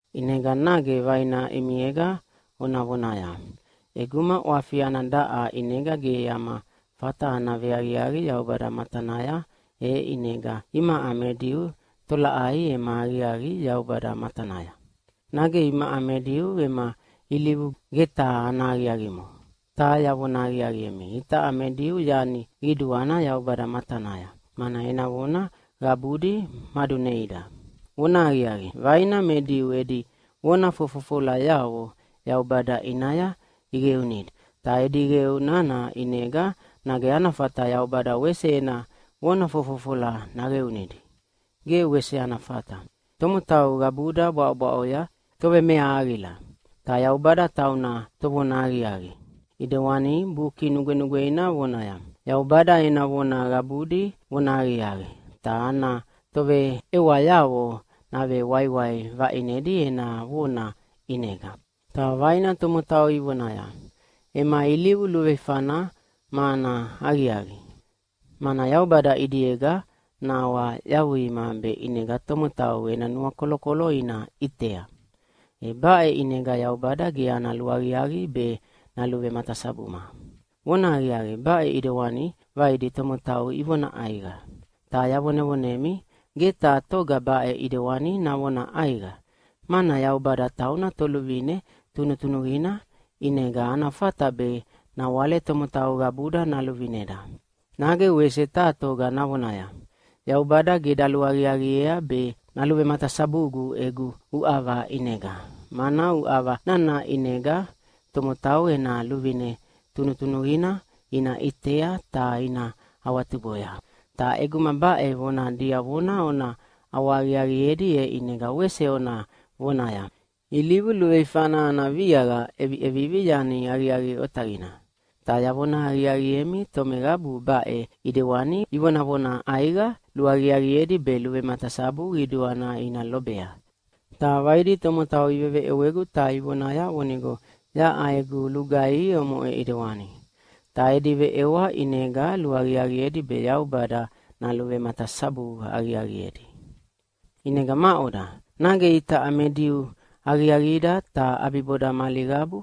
ʼInega nage vaina ʼimiega ona vonaya, “ʼEguma ʼwafi ana daʼa ʼinega ge ama fata ana veaqiaqi Yaubada matanaya, e ʼinega imaʼa me Diu tolaʼai ema aqiaqi Yaubada matanaya? Nage imaʼa me Diu ema ilivu ge taha ana aqiaqimo?” Ta yavona aqiaqiemi, itaʼa me Diu yani qiduana Yaubada matanaya, mana ena vona qabudi maduneida. Vonahaqiaqi, vaina me Diu edi vona fofofolayavo Yaubada ʼinaya iqeunidi. Ta edi qeu nana ʼinega nage ana fata Yaubada wese ena vona fofofola naqeunidi? Ge wese ana fata! Tomotau qabuda bwaʼobwaʼoya tovemeahaqila, ta Yaubada tauna Tovonahaqiaqi. ʼIdewani Buki Nugwenugweina vonaya, “Yaubada ena vona qabudi vonahaqiaqi, ta ana toveʼewayavo navewaiwai vaʼinedi ena vona ʼinega.” Ta vaina tomotau ivonaya, “Ema ilivu luveifana ma ana aqiaqi, mana Yaubada ʼidiega nahawayavuima be ʼinega tomotau ena nuakolokolo ina ʼitea. E baʼe ʼinega Yaubada ge ana luaqiaqi be naluvematasabuma.” (Vonahaqiaqi, baʼe ʼidewani vaidi tomotau ivona ʼaiqa.) Ta yavonevonemi, ge taha toga baʼe ʼidewani navona ʼaiqa! Mana Yaubada tauna Toluvine tunutunuqina, ʼinega ana fata be nawale tomotau qabuda naluvineda. Nage wese taha toga navonaya, “Yaubada ge daluaqiaqiea be naluvematasabugu egu uʼava ʼinega, mana uʼava nana ʼinega tomotau ena luvine tunutunuqina ina ʼitea ta ina awatuboya.” Ta ʼeguma baʼe vona diavona ona ʼawahaqiaqiedi, e ʼinega wese ona vonaya, “Ilivu luveifana ana viaqa ʼeviʼevivi yani aqiaqi otaqina!” Ta yavona aqiaqiemi, tomeqabu baʼe ʼidewani ivonavona ʼaiqa luaqiaqiedi be luvematasabu qiduana ina lobea! Ta vaidi tomotau iveveʼewegu ta ivonaya vonigo yaʼa egu lugaihi omoʼe ʼidewani. Ta edi veʼewa ʼinega luaqiaqiedi be Yaubada naluvematasabu aqiaqiedi. ʼInega maʼoda, nage itaʼa me Diu aqiaqida, ta ʼabiboda mali qabu?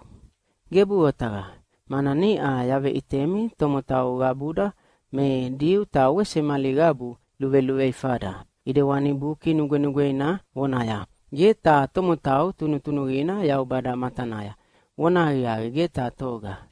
Gebuʼe otaqa! Mana niʼa yaveʼitemi tomotau qabuda me Diu ta wese mali qabu luveluveifada. ʼIdewani Buki Nugwenugweina vonaya, “Ge taha tomotau tunutunuqina Yaubada matanaya, vonahaqiaqi ge taha toga.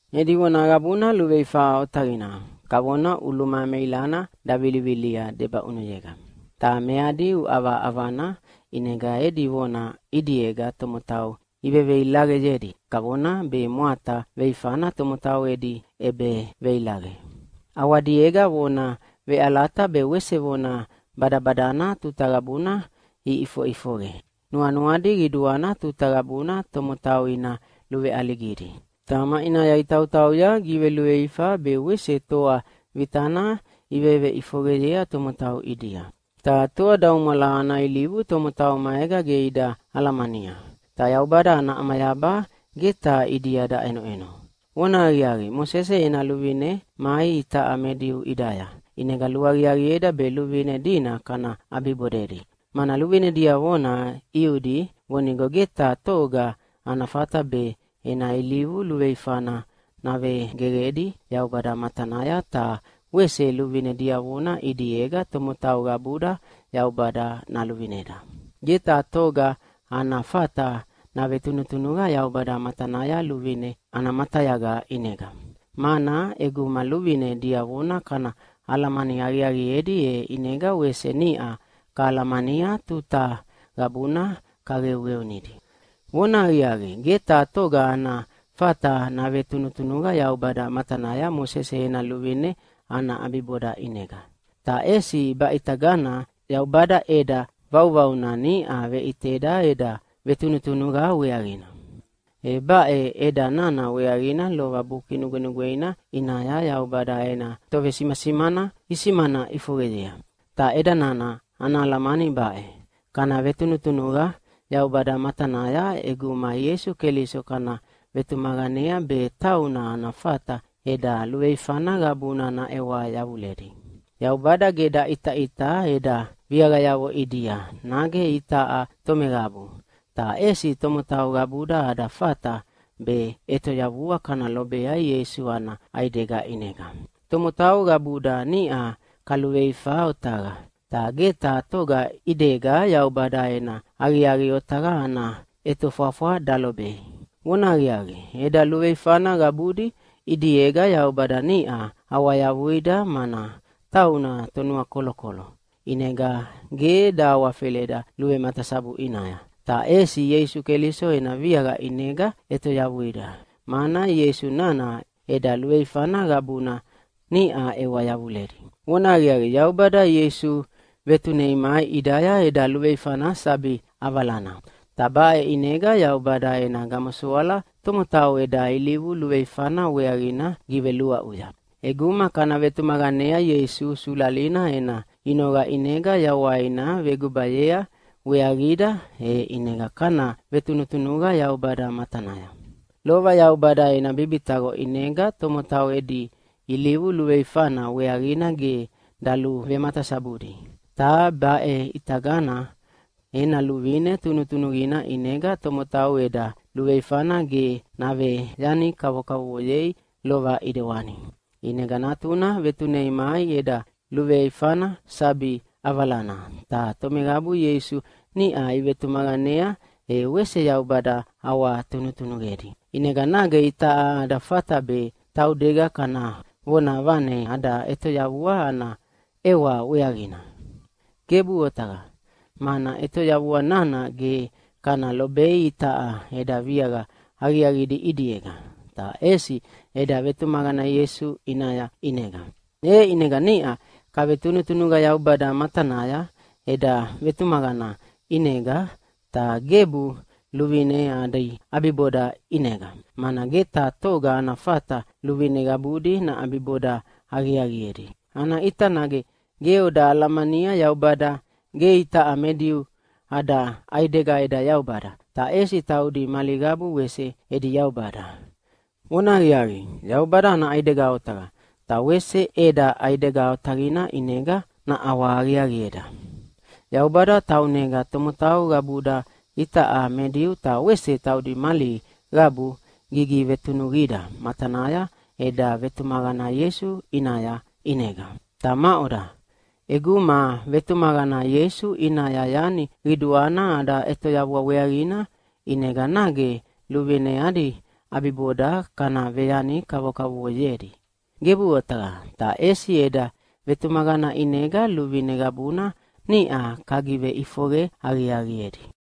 “Edi vona qabuna luveifa otaqina, kavona ʼuluma meilana davilivilia debaʼunuyega.” “Ta meadi uʼava ʼavana, ʼinega edi vona ʼidiega tomotau iveveilaqeyedi kavona be mwata veifana tomotau edi ʼebeveilaqe.” “ʼAwadiega vona veʼalata be wese vona badabadana tuta qabuna ʼifoʼifoqe.” “Nuanuadi qiduana tuta qabuna tomotau ina luveʼaligidi. Ta maʼinaya itautauya giveluveifa be wese toa vitana iveveʼifoqeyea tomotau ʼidia. Ta toadaumwala ana ilivu tomotau maega ge ida alamania.” “Ta Yaubada ana ʼamayaba ge taha ʼidia daʼenoʼeno.” Vonahaqiaqi, Mosese ena luvine mai itaʼa me Diu ʼidaya, ʼinega luaqiaqieda be luvine dina kana ʼabibodedi. Mana luvine diavona ʼiudi vonigo ge taha toga ana fata be ena ilivu luveifana navegeqedi Yaubada matanaya, ta wese luvine diavona ʼidiega tomotau qabuda Yaubada naluvineda. Ge taha toga ana fata navetunutunuqa Yaubada matanaya luvine ana matayaga ʼinega. Mana ʼeguma luvine diavona kana alamani aqiaqiedi, e ʼinega wese niʼa kahalamania tuta qabuna kaqeuqeunidi. Vonahaqiaqi, ge taha toga ana fata navetunutunuqa Yaubada matanaya Mosese ena luvine ana ʼabiboda ʼinega. Ta ʼesi baʼitagana Yaubada ʼeda vauvauna niʼa veʼiteda eda vetunutunuqa weaqina. E baʼe ʼeda nana weaqina lova Buki Nugwenugweina ʼinaya Yaubada ena tovesimasimana isimana ʼifoqeyea. Ta ʼeda nana ana alamani baʼe: Kana vetunutunuqa Yaubada matanaya ʼeguma Ieisu Keliso kana vetumaqanea be tauna ana fata eda luveifana qabuna naʼewa yavuledi. Yaubada ge daʼitaʼita eda viaqayavo ʼidia, nage itaʼa tomeqabu, ta ʼesi tomotau qabuda ada fata be ʼetoyavua kana lobea Ieisu ana ʼaidega ʼinega. Tomotau qabuda niʼa kaluveifa otaqa, ta ge taha toga ʼidega Yaubada ena aqiaqi otaqa ana ʼetofwafwa dalobei. Vonahaqiaqi, eda luveifana qabudi ʼidiega Yaubada niʼa awayavuida, mana tauna Tonuakolokolo, ʼinega ge dahawafeleda luvematasabu ʼinaya. Ta ʼesi Ieisu Keliso ena viaqa ʼinega ʼetoyavuida, mana Ieisu nana eda luveifana qabuna niʼa ʼewa yavuledi. Vonahaqiaqi, Yaubada Ieisu vetunei mai ʼidaya eda luveifana sabi ʼavalana. Ta baʼe ʼinega Yaubada ena gamosoala tomotau eda ilivu luveifana weaqina giveluaʼuya. ʼEguma kana vetumaqanea Ieisu sulalina ena inoqa ʼinega yawaina vegubayea weaqida, e ʼinega kana vetunutunuqa Yaubada matanaya. Lova Yaubada ena bibitaqo ʼinega tomotau edi ilivu luveifana weaqina ge daluvematasabudi, ta baʼe ʼitagana ena luvine tunutunuqina ʼinega tomotau eda luveifana ge naveyani kavokavovoyei lova ʼidewani. ʼInega Natuna vetunei mai eda luveifana sabi ʼavalana, ta tomeqabu Ieisu niʼa ivetumaqanea, e wese Yaubada ʼawatunutunuqedi. ʼInega nage itaʼa ada fata be taudega kana vonavane ada ʼetoyavua ana ʼewa weaqina? Gebuʼe otaqa! Mana ʼetoyavua nana ge kana lobei itaʼa eda viaqa aqiaqidi ʼidiega, ta ʼesi eda vetumaqana Ieisu ʼinaya ʼinega. E ʼinega niʼa kavetunutunuqa Yaubada matanaya eda vetumaqana ʼinega, ta gebu luvine adi ʼabiboda ʼinega, mana ge taha toga ana fata luvine qabudi naʼabiboda aqiaqiedi. Ana ʼita nage ge oda alamania Yaubada ge itaʼa me Diu ada ʼaidega eda Yaubada, ta ʼesi taudi mali qabu wese edi Yaubada. Vonahaqiaqi, Yaubada ana ʼaidega otaqa, ta wese ʼeda ʼaidega otaqina ʼinega naʼawahaqiaqieda. Yaubada taunega tomotau qabuda itaʼa me Diu ta wese taudi mali qabu gigivetunuqida matanaya eda vetumaqana Ieisu ʼinaya ʼinega. Ta maʼoda, ʼeguma vetumaqana Ieisu ʼinaya yani qiduana ada ʼetoyavua weaqina, ʼinega nage luvine adi ʼabiboda kana veyani kavokavovoyedi? Gebuʼe otaqa! Ta ʼesi eda vetumaqana ʼinega luvine qabuna niʼa kagiveʼifoqe aqiaqiedi.